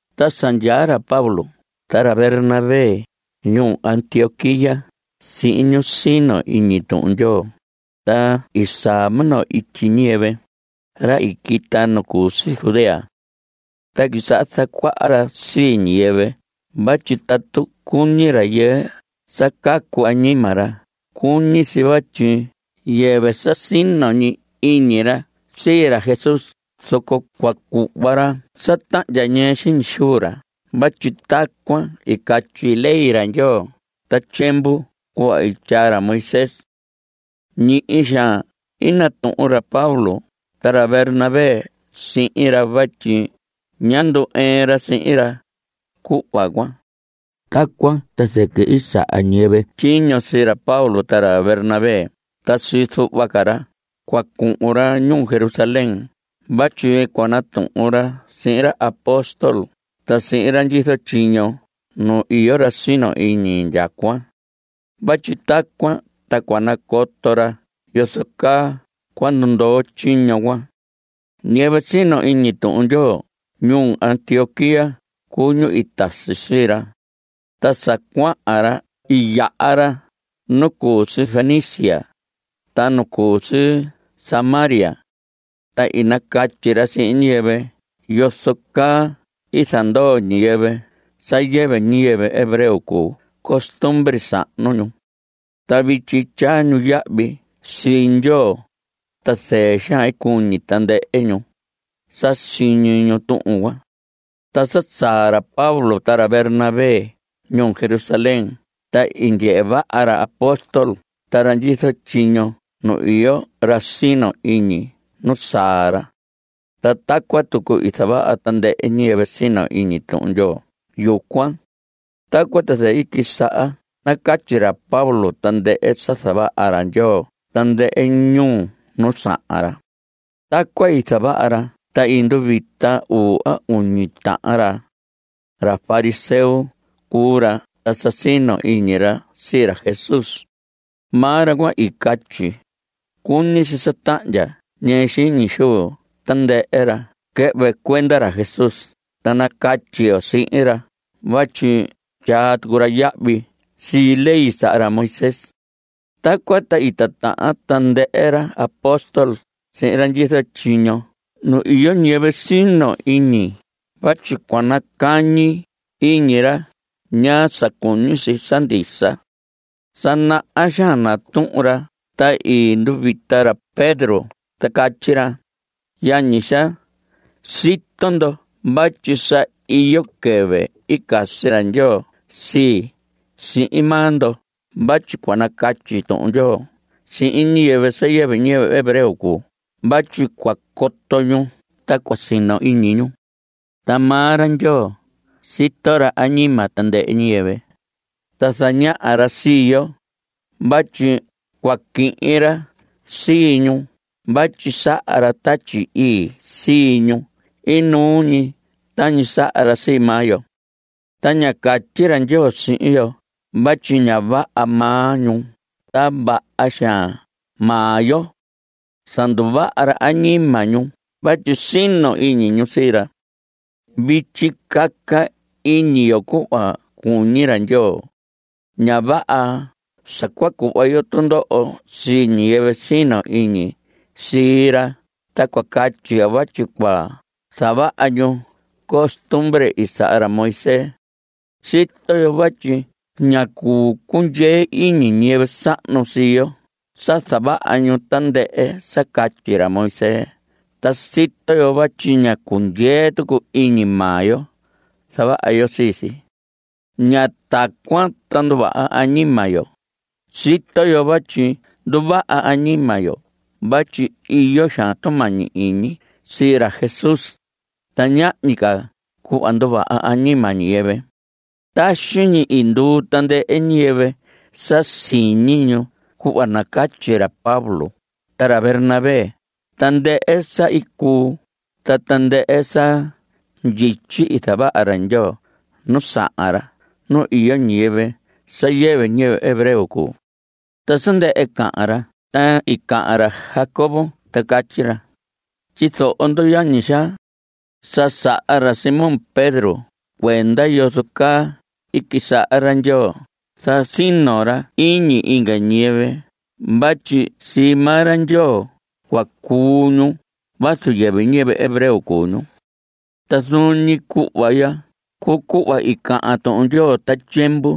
Ta sa ndyaa ra Pablo ta ra Bernabé ñuu Antioquía sihin ñu sino iñi Tuhun Ndyoo, ta i saa minoo ityi ñiyɨvɨ, ra i quita nu cu si Judea. Ta i quisaha zacuaha ra sii ñiyɨvɨ vatyi tatu cuñi rayɨɨ sa cacu añima ra cuñi si vatyi yɨvɨ sa sino ñi iñi ra sii ra Jesús zoco cua cuhva ra sa tahndya ñɨɨ xiñi xuu ra vatyi tacuan i catyi ley ra Ndyoo ta tyiemvu cuhva i tyaa ra Moisés. Ñihi xaan i natuhun ra Pablo ta ra Bernabé sihin ra vatyi ñá ndu‑ɨɨn ra sihin ra, cuhva cuan. Tacuan ta zɨquɨ i saha ñiyɨvɨ tyiño sii ra Pablo ta ra Bernabé ta sii zuhva ca ra cua cuhun ra ñuu Jerusalén vatyi cua natuhun ra sihin ra apóstol ta sihin ra ndyizo tyiño nu iyo ra sino iñi indyacuan. Vatyi tacuan ta cua nacoto ra yozo caa cua ndundoo tyiño cuan. Ñiyɨvɨ sino iñi Tuhun Ndyoo ñuu Antioquía cuu ñu i tasi sii ra. Ta sa cuahan ra i yaha ra nu cu si Fenicia, ta nu cu si Samaria. Ta i nacatyi ra sihin ñiyɨvɨ yozo caa i zandoo ñiyɨvɨ sa yɨvɨ ñiyɨvɨ hebreo cuu costumbre sahnu ñu. Ta vityi tyaa ñu yahvi sii Ndyoo. Ta zɨɨ xaan i cuñi tandɨhɨ ñu, sa siñi ñu tuhun cuan. Ta sa saa ra Pablo ta ra Bernabé ñuu Jerusalén ta i ndyehe vaha ra apóstol ta ra ndyizo tyiño nu iyo ra sino iñi nu saa ra. Ta tacuan tucu i zavaha tandɨhɨ ñiyɨvɨ sino iñi Tuhun Ndyoo yucuan. Tacuan ta zɨquɨ i quisaha nacatyi ra Pablo tandɨhɨ sa zavaha ra Ndyoo tandɨhɨ ñuu nu sahan ra. Tacuan i zavaha ra ta i nduvita uu, a uñi tahan ra. Ra fariseo cuu ra, ta sa sino iñi ra sii ra Jesús. Maa ra cuan i catyi: Cuñi si sa tahndya ñɨɨ xiñi xuu tandɨhɨ ra quɨhvɨ cuenda ra Jesús ta nacatyi yo sihin ra vatyi tyaa tucu ra yahvi sii ley i saha ra Moisés. Tacuan ta i titahan tandɨhɨ ra apóstol sihin ra ndyizo tyiño nu iyo ñiyɨvɨ sino iñi vatyi cua nacañi iñi ra ñaa sa cuñi si sa ndisa. Sa naha xaan natuhun ra ta i nduvita ra Pedro ta catyi ra: Yañi xaa, sito ndo vatyi sa iyo quɨvɨ i casi ra Ndyoo sii, sihin maa ndo vatyi cua nacatyi Tuhun Ndyoo sihin ñiyɨvɨ sa yɨvɨ ñiyɨvɨ hebreo cuu vatyi cua coto ñu ta cua sino iñi ñu. Ta maa ra Ndyoo, sito ra añima tandɨhɨ ñiyɨvɨ, ta zañaha ra sii yo vatyi cua quihin ra sii ñu vatyi saha ra Tatyi Ii sii ñu inuu ñi tañi saha ra sii maa yo. Ta ña catyi ra Ndyoo sihin yo vatyi ña vaha maa ñu ta vaha xaan maa yo. Zanduvaha ra añima ñu vatyi sino iñi ñu sii ra. Vityi caca iñi yo cuhva cuñi ra Ndyoo. Ña vaha sa cua cuhva yo tundoho sii ñiyɨvɨ sino iñi sii ra ta cua catyi yo vatyi cua zavaha ñu costumbre i saha ra Moisés. Sito yo vatyi ñá cuu cundyee iñi ñiyɨvɨ sahnu sii yo sa zavaha ñu tandɨhɨ sa catyi ra Moisés, ta sito yo vatyi ñá cundyee tucu iñi maa yo zavaha yo sii si. Ña tacuan ta nduvaha añima yo. Sito yo vatyi nduvaha añima yo vatyi iyo xaan tumañi iñi sii ra Jesús. Ta ñahñi ca cuhva nduvaha añima ñiyɨvɨ. Taxi ñi i nduu tandɨhɨ ñiyɨvɨ sa siñi ñu cuhva nacatyi ra Pablo ta ra Bernabé tandɨhɨ sa i cuu ta tandɨhɨ sa ndyityi i zavaha ra Ndyoo nu sahan ra nu iyo ñiyɨvɨ sa yɨvɨ ñiyɨvɨ hebreo cuu. Ta sa ndɨhɨ cahan ra ta i cahan ra Jacobo ta catyi ra: Tyizoho ndo, yañi xaa. Sa saha ra Simón Pedro cuenda yozo caa i quisaha ra Ndyoo zasino ra iñi inga ñiyɨvɨ vatyi sii maa ra Ndyoo cua cuu ñu vazu yɨvɨ ñiyɨvɨ hebreo cuu ñu. Ta zuun ñi cuhva ya cuu cuhva i cahan Tuhun Ndyoo ta tyiemvu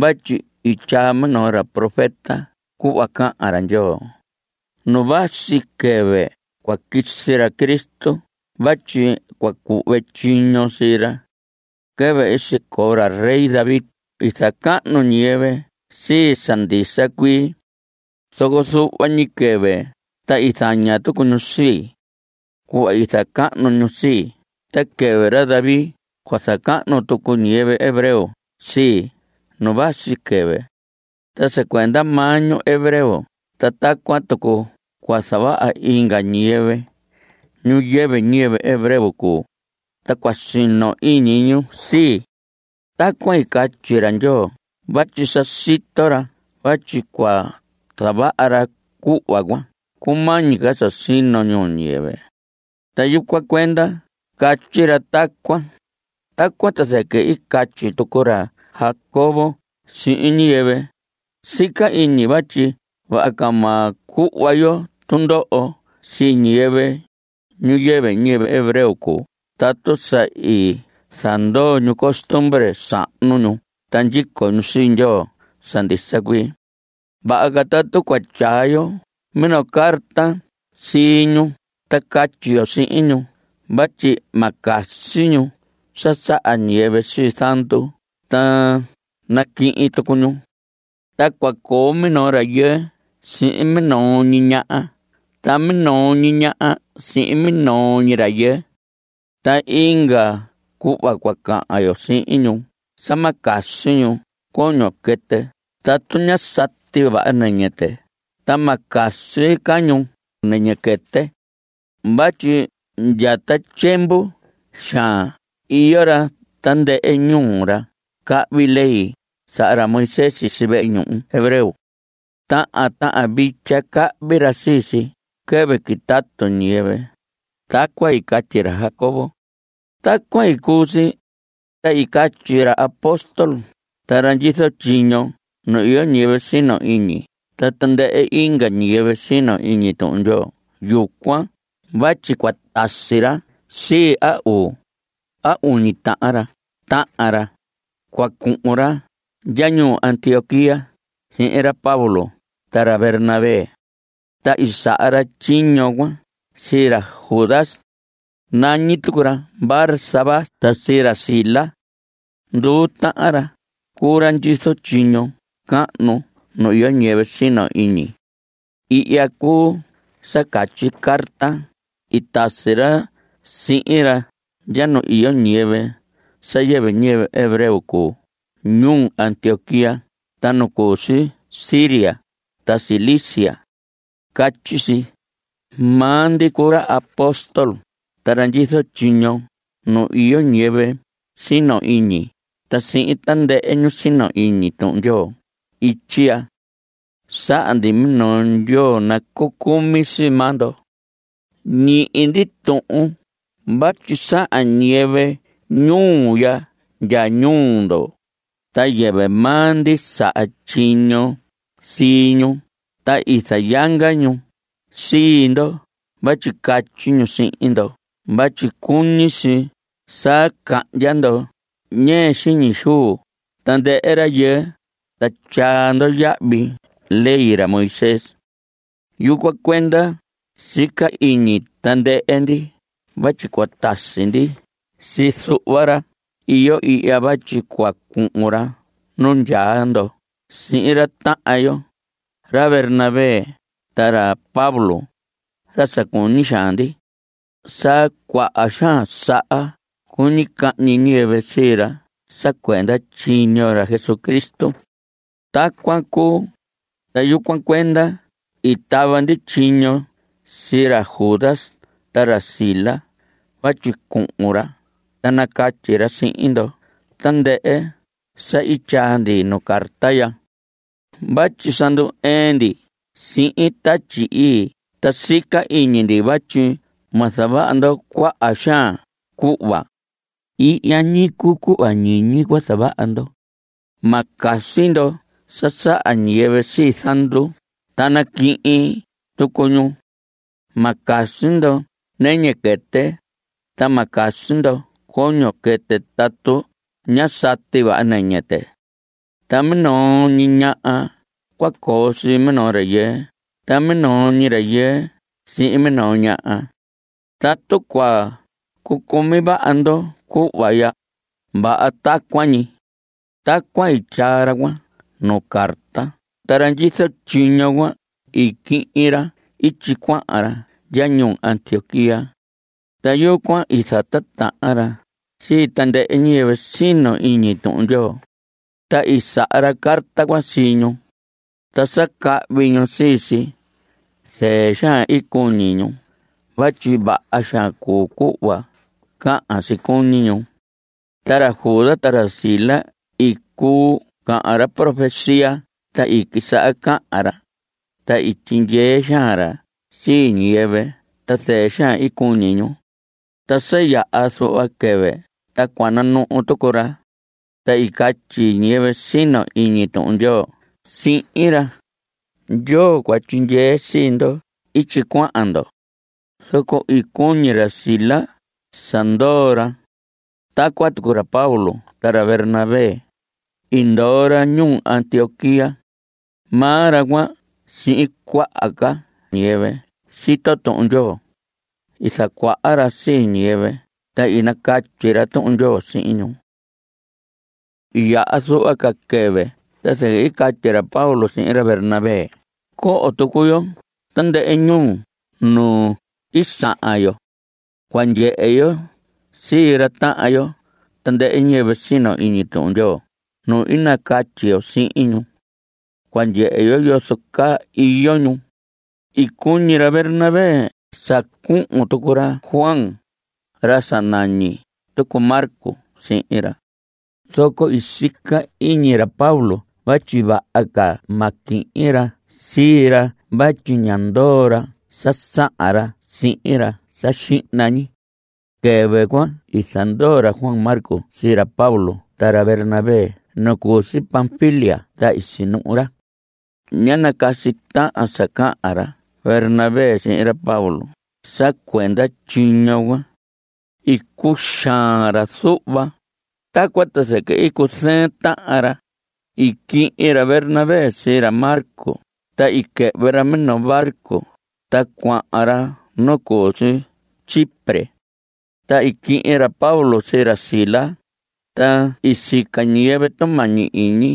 vatyi i tyaa minoo ra profeta cuhva cahan ra Ndyoo: Nu vasi quɨvɨ cua quisi ra Cristo vatyi cua cuhve tyiño sii ra. Quɨvɨ i sicoo ra rey David i zacahnu ñiyɨvɨ sii sa ndisa cuii. Zoco zuhva ñi quɨvɨ ta i zaña tucu ñu sii. Cuhva i zacahnu ñu sii, ta quɨvɨ ra David cua zacahnu tucu ñiyɨvɨ hebreo sii nu vasi quɨvɨ. Ta sa cuenda maa ñu hebreo ta tacuan tucu cua zavaha inga ñiyɨvɨ, ñu yɨvɨ ñiyɨvɨ hebreo cuu, ta cua sino iñi ñu sii. Tacuan i catyi ra Ndyoo vatyi sa sito ra vatyi cua zavaha ra cuhva cuan cumañi ca sino ñuu ñiyɨvɨ. Ta yucuan cuenda i catyi ra tacuan. Tacuan ta zɨquɨ i catyi tucu ra Jacobo sihin ñiyɨvɨ: Sica iñi vatyi vaha ca ma cuhva yo tundoho sii ñiyɨvɨ, ñu yɨvɨ ñiyɨvɨ hebreo cuu tatu sa i zandoo ñu costumbre sahnu ñu ta ndyico ñu sii Ndyoo sa ndisa cuii. Vaha ca tatu cua tyaa yo minoo carta sii ñu ta catyi yo sihin ñu vatyi ma casi ñu sa saha ñiyɨvɨ sii zandu ta naquihin tucu ñu. Ta cua coo minoo rayɨɨ sihin minoo ñi ñaha ta minoo ñi ñaha sihin minoo ñi rayɨɨ. Ta inga cuhva cua cahan yo sihin ñu sa ma casi ñu coño quɨtɨ tatu ña sati vaha nɨñɨ tɨ ta ma casi ca ñu nɨñɨ quɨtɨ. Vatyi ndya ta tyiemvu xaan iyo ra tandɨhɨ ñuu, ra cahvi ley saha ra Moisés sisi vehe ñuhu hebreo. Tahan tahan vitya cahvi ra sii si quɨvɨ quitatu ñiyɨvɨ. Tacuan i catyi ra Jacobo. Tacuan i cuu si, ta i catyi ra apóstol ta ra ndyizo tyiño nu iyo ñiyɨvɨ sino iñi ta tandɨhɨ inga ñiyɨvɨ sino iñi Tuhun Ndyoo yucuan vatyi cua tasi ra sii a uu, a uñi tahan ra tahan ra, cua cuhun ra ndya ñuu Antioquía sihin ra Pablo ta ra Bernabé. Ta i saha ra tyiño cuan sii ra Judas. Nañi tucu ra Barsabás ta sii ra Silas. Nduu tahan ra cuu ra ndyizo tyiño cahnu nu iyo ñiyɨvɨ sino iñi. Ihya cuu sa catyi carta i tasi ra sihin ra ndya nu iyo ñiyɨvɨ sa yɨvɨ ñiyɨvɨ hebreo cuu ñuu Antioquía ta nu cu si Siria ta Cilicia. Catyi si: “Maa ndi cuu ra apóstol ta ra ndyizo tyiño nu iyo ñiyɨvɨ sino iñi ta sihin tandɨhɨ ñu sino iñi Tuhun Ndyoo ityi ya. Saha ndi minoo ndyoo nacucumi sii maa ndo. Ñihi ndi tuhun vatyi sahan ñiyɨvɨ ñuu ya ndya ñuu ndo, ta yɨvɨ maa ndi saha tyiño sii ñu ta i zayanga ñu sii ndo vatyi catyi ñu sihin ndo vatyi cuñi si sa cahndya ndo ñɨɨ xiñi xuu tandɨhɨ rayɨɨ ta tyaa ndo yahvi ley ra Moisés. Yucuan cuenda sica iñi tandɨhɨ ndi vatyi cua tasi ndi sii zuhva ra iyo ihya vatyi cua cuhun ra nu ndyaa ndo sihin ra tahan yo, ra Bernabé ta ra Pablo, ra sa cuñi xaan ndi. Sa cuaha xaan saha cuñi cahñi ñiyɨvɨ sii ra sa cuenda tyiño ra Jesucristo. Tacuan cuu. Ta yucuan cuenda i tava ndi tyiño sii ra Judas ta ra Silas vatyi cuhun ra ta nacatyi ra sihin ndo tandɨhɨ sa i tyaa ndi nuu carta ya. Vatyi sa ndu‑ɨɨn ndi sihin Tatyi Ii ta sica iñi ndi vatyi ma zavaha ndo cuaha xaan cuhva. Ihya ñi cuu cuhva ñiñi cua zavaha ndo: Ma casi ndo sa saha ñiyɨvɨ sii zandu ta naquihin tucu ñu. Ma casi ndo nɨñɨ quɨtɨ, ta ma casi ndo coño quɨtɨ tatu ñá sati vaha nɨñɨ tɨ. Ta minoo ñi ñaha cua coo sii minoo rayɨɨ ta minoo ñi rayɨɨ sihin minoo ñaha. Tatu cua cucumi vaha ndo cuhva ya, vaha tacuan ñi.” Tacuan i tyaa ra cuan nuu carta ta ra ndyizo tyiño cuan i quihin ra ityi cuahan ra ndya ñuu Antioquía. Ta yucuan i zatitahan ra sii tandɨhɨ ñiyɨvɨ sino iñi Tuhun Ndyoo. Ta i saha ra carta cuan sii ñu. Ta sa cahvi ñu sii si, zɨɨ xaan i cuñi ñu vatyi vaha xaan cuu cuhva cahan si cuñi ñu. Ta ra Judas ta ra Silas i cuu cahan ra profecía, ta i quisaha cahan ra, ta i tyindyee xaan ra sii ñiyɨvɨ ta zɨɨ xaan i cuñi ñu. Ta sa yaha zuhva quɨvɨ ta cua nanuhu tucu ra. Ta i catyi ñiyɨvɨ sino iñi Tuhun Ndyoo sihin ra: Ndyoo cua tyindyee sii ndo ityi cuahan ndo. Zoco i cuñi ra Silas sa ndoo ra. Tacuan tucu ra Pablo ta ra Bernabé i ndoo ra ñuu Antioquía. Maa ra cuan sihin cuaha ca ñiyɨvɨ sito Tuhun Ndyoo, i zacuaha ra sii ñiyɨvɨ ta i nacatyi ra Tuhun Ndyoo sihin ñu. I yaha zuhva ca quɨvɨ ta zɨquɨ catyi ra Pablo sihin ra Bernabé: Coho tucu yo tandɨhɨ ñuu nu i sahan yo. Cua ndyehe yo sii ra tahan yo, tandɨhɨ ñiyɨvɨ i sino iñi Tuhun Ndyoo nu i nacatyi yo sihin ñu. Cua ndyehe yo yozo caa iyo ñu. I cuñi ra Bernabé sa cuhun tucu ra Juan, ra sa nañi tucu Marcos sihin ra. Zoco i sica iñi ra Pablo vatyi vaha ca ma quihin ra sii ra vatyi ñá ndoo ra sa sahan ra sihin ra sa xihna ñi. Quɨvɨ cuan i zandoo ra Juan Marcos sii ra Pablo ta ra Bernabé nu cu si Panfilia ta i sinuhu ra. Ña nacasi tahan sa cahan ra Bernabé sihin ra Pablo sa cuenda tyiño cuan. I cuxaan ra zuhva. Tacuan ta zɨquɨ i cuzɨɨn tahan ra. I quihin ra Bernabé sii ra Marcos ta i quɨhvɨ ra minoo barco ta cuahan ra nu cu si Chipre. Ta i quihin ra Pablo sii ra Silas. Ta i sica ñiyɨvɨ tumañi iñi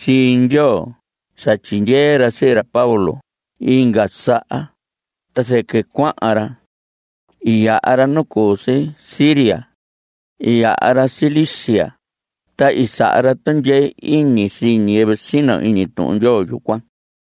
sii Ndyoo sa tyindyee ra sii ra Pablo inga saha. Ta zɨquɨ cuahan ra. I yaha ra nu cu si Siria. I yaha ra Cilicia. Ta i saha ra tundyee iñi sii ñiyɨvɨ sino iñi Tuhun Ndyoo yucuan.